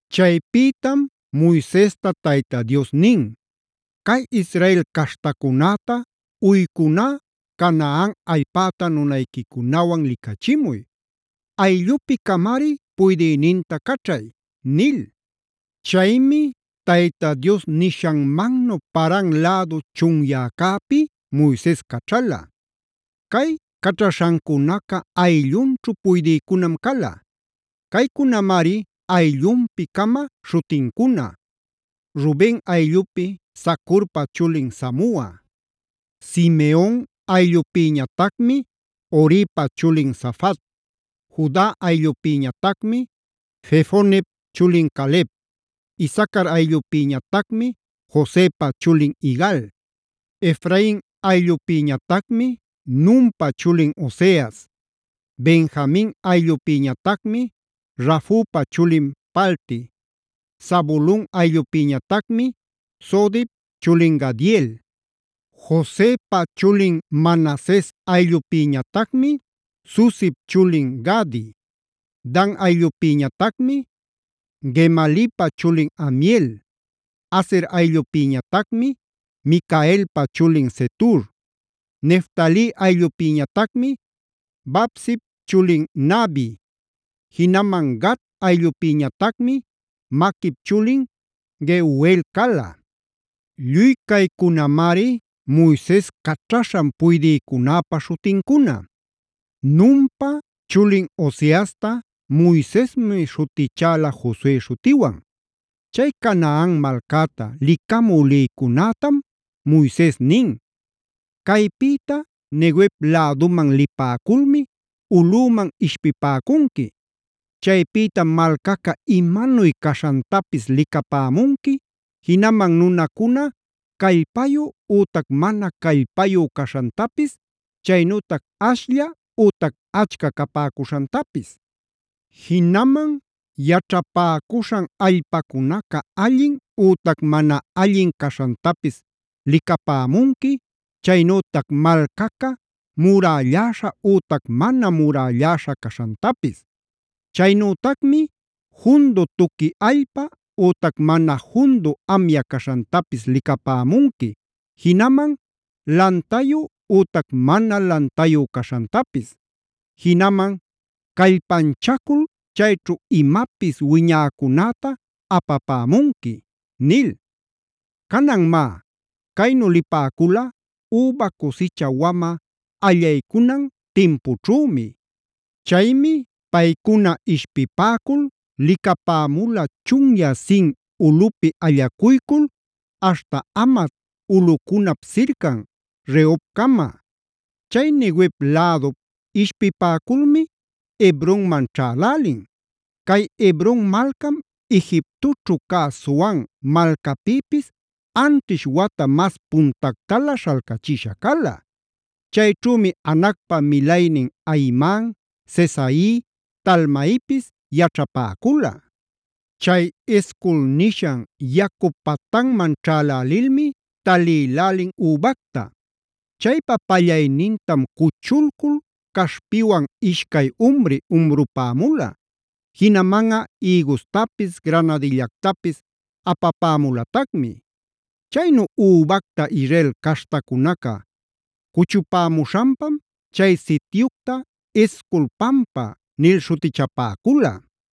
Chaypïtam Moisesta Tayta Dios nin: “Cay Israel caśhtacunäta uycuná Canaan allpäta nunayquicunawan licachimuy. Ayllupi-camari puydïninta caćhay” nil. Chaymi Tayta Dios nishanmannu Paran lädu chunyäcäpi Moises caćhala. Cay caćhaśhancunaca ayllunćhu puydïcunam cala. Caycunamari ayllunpi-cama śhutincuna: Ruben ayllupi Zacurpa chulin Samua. Simeon ayllupïñatacmi Horipa chulin Safat; Juda ayllupïñatacmi Jefonep chulin Caleb; Isacar ayllupïñatacmi Josepa chulin Igal; Efrain ayllupïñatacmi Nunpa chulin Oseas; Benjamin ayllupïñatacmi Rafupa chulin Palti; Zabulon ayllupïñatacmi Sodip chulin Gadiel; Josepa chulin Manases ayllupïñatacmi Susip chulin Gadi; Dan ayllupïñatacmi Gemalipa chulin Amiel; Aser ayllupïñatacmi Micaelpa chulin Setur; Neftali ayllupïñatacmi Vapsip chulin Nahbi; jinaman Gad ayllupïñatacmi Maquip chulin Geuel cala. Lluy caycunamari Moises caćhaśhan puydïcunäpa śhutincuna. Nunpa chulin Oseasta Moisesmi śhutichäla Josue śhutiwan. Chay Canaan malcäta licamü lïcunätam Moises nin: “Caypïta Neguev läduman lipäculmi ulꞌüman ishpipäcunqui. Chaypïtam malcaca imanuy caśhantapis licapämunqui, jinaman nunancuna callpayu ütac mana callpayu caśhantapis, chaynütac ashlla ütac achca capäcuśhantapis. Jinaman yaćhapäcuśhan allpacunaca allin ütac mana allin caśhantapis licapämunqui, chaynütac malcaca muralläśha ütac mana murälläśha caśhantapis. Chaynütacmi jundu tuqui allpa ütac mana jundu amya caśhantapis licapämunqui, jinaman lantayu ütac mana lantayu caśhantapis. Jinaman callpanchacul chayćhu imapis wiñäcunäta apapämunqui” nil. Canan má, caynu lipäcula üba cusicha wamä allaycunan timpućhümi. Chaymi paycuna ishpipäcul licapämula chunyä Zin ulꞌupi allacuycul aśhta Hamat ulꞌucunap sircan Rehobcama. Chay Neguev lädup ishpipäculmi Hebronman ćhälälin. Cay Hebron malcam Egiptoćhu cä Zoan malcäpïpis anćhish wata mas puntactalä śhalcachisha cala. Chayćhümi Anacpa milaynin Ahiman, Sesai, Talmaipis yaćhapäcula. Chay Escol nishan yacu patanman ćhälälilmi talïlälin übacta. Chaypa pallaynintam cuchulcul caśhpiwan ishcay umri umrupämula. Jinamanꞌa ïgustapis, granadillactapis apapämulatacmi. Chaynu übacta Israel caśhtacunaca cuchupämuśhanpam chay sityucta “Escol pampa”a nil śhutichapäcula.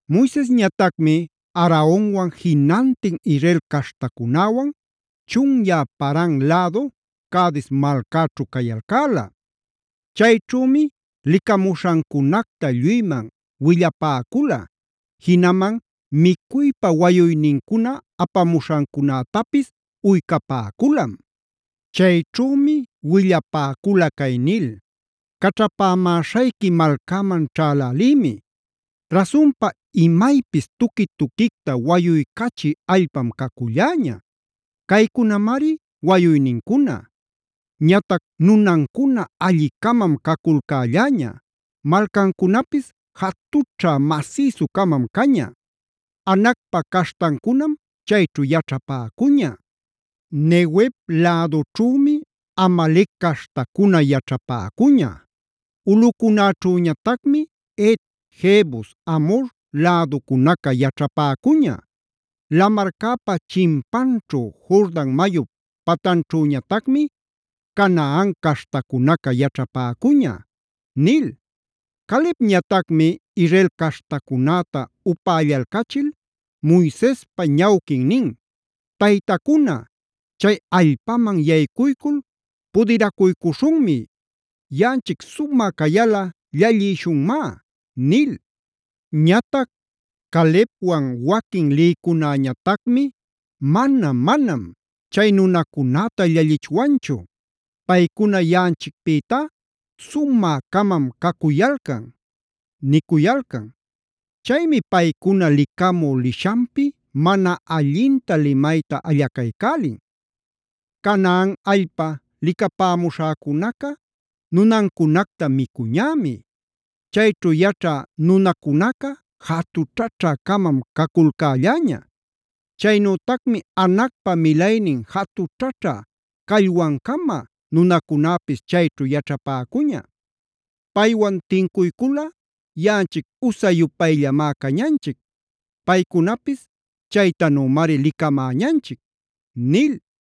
Moisesñatacmi Aaronwan jinantin Israel caśhtacunäwan chunyä Paran lädu Cades malcäćhu cayalcäla. Chayćhümi licamuśhancunacta lluyman willapäcula; jinaman micuypa wayuynincuna apamuśhancunätapis uycapäculam. Chayćhümi willapäcula cay nil: “Caćhapämäśhayqui malcäman ćhälälïmi. Rasunpa imaypis tuqui-tuquicta wayuycachï allpam caculläña. Caycunamari wayuynincuna. Ñatac nunancuna alli-camam caculcälläña. Malcancunapis jatućhä masïsu-camam caña; Anacpa caśhtancunam chayćhu yaćhapäcuña. Neguev lädućhümi Amalec caśhtacuna yaćhapäcuña; ulꞌucunäćhüñatacmi Het, Jebus, Amhor läducunaca yaćhapäcuña. Lamarcäpa chimpanćhu, Jordan mayup patanćhüñatacmi Canaan caśhtacunaca yaćhapäcuña” nil. Calebñatacmi Israel caśhtacunäta upällalcachil Moisespa ñawquin nin: “Taytacuna, chay allpaman yaycuycul pudiracuycuśhunmi. Yaꞌanchic sumä cayalꞌa llallïshunmá” nil. Ñatac Calebwan waquin lïcunäñatacmi: “Manam-manam, chay nunacunäta llallichwanchu. Paycuna yaꞌanchicpïtá sumä-camam cacuyalcan” nin. Chaymi paycuna licamü lishanpi mana allinta limayta allacaycälin: “Canaan allpa licapämuśhäcunaca nunancunacta micuñämi. Chayćhu yaćhä nunacunaca jatućhäćhä-camam caculcälläña. Chaynütacmi Anacpab milaynin jatućhaćhä callwan-cama nunacunäpis yaćhapäcuña. Paywan tincuyculꞌa yaꞌanchic usa-yupayllamá cañanchic; paycunapis chaytanümari licamäñanchic” nil.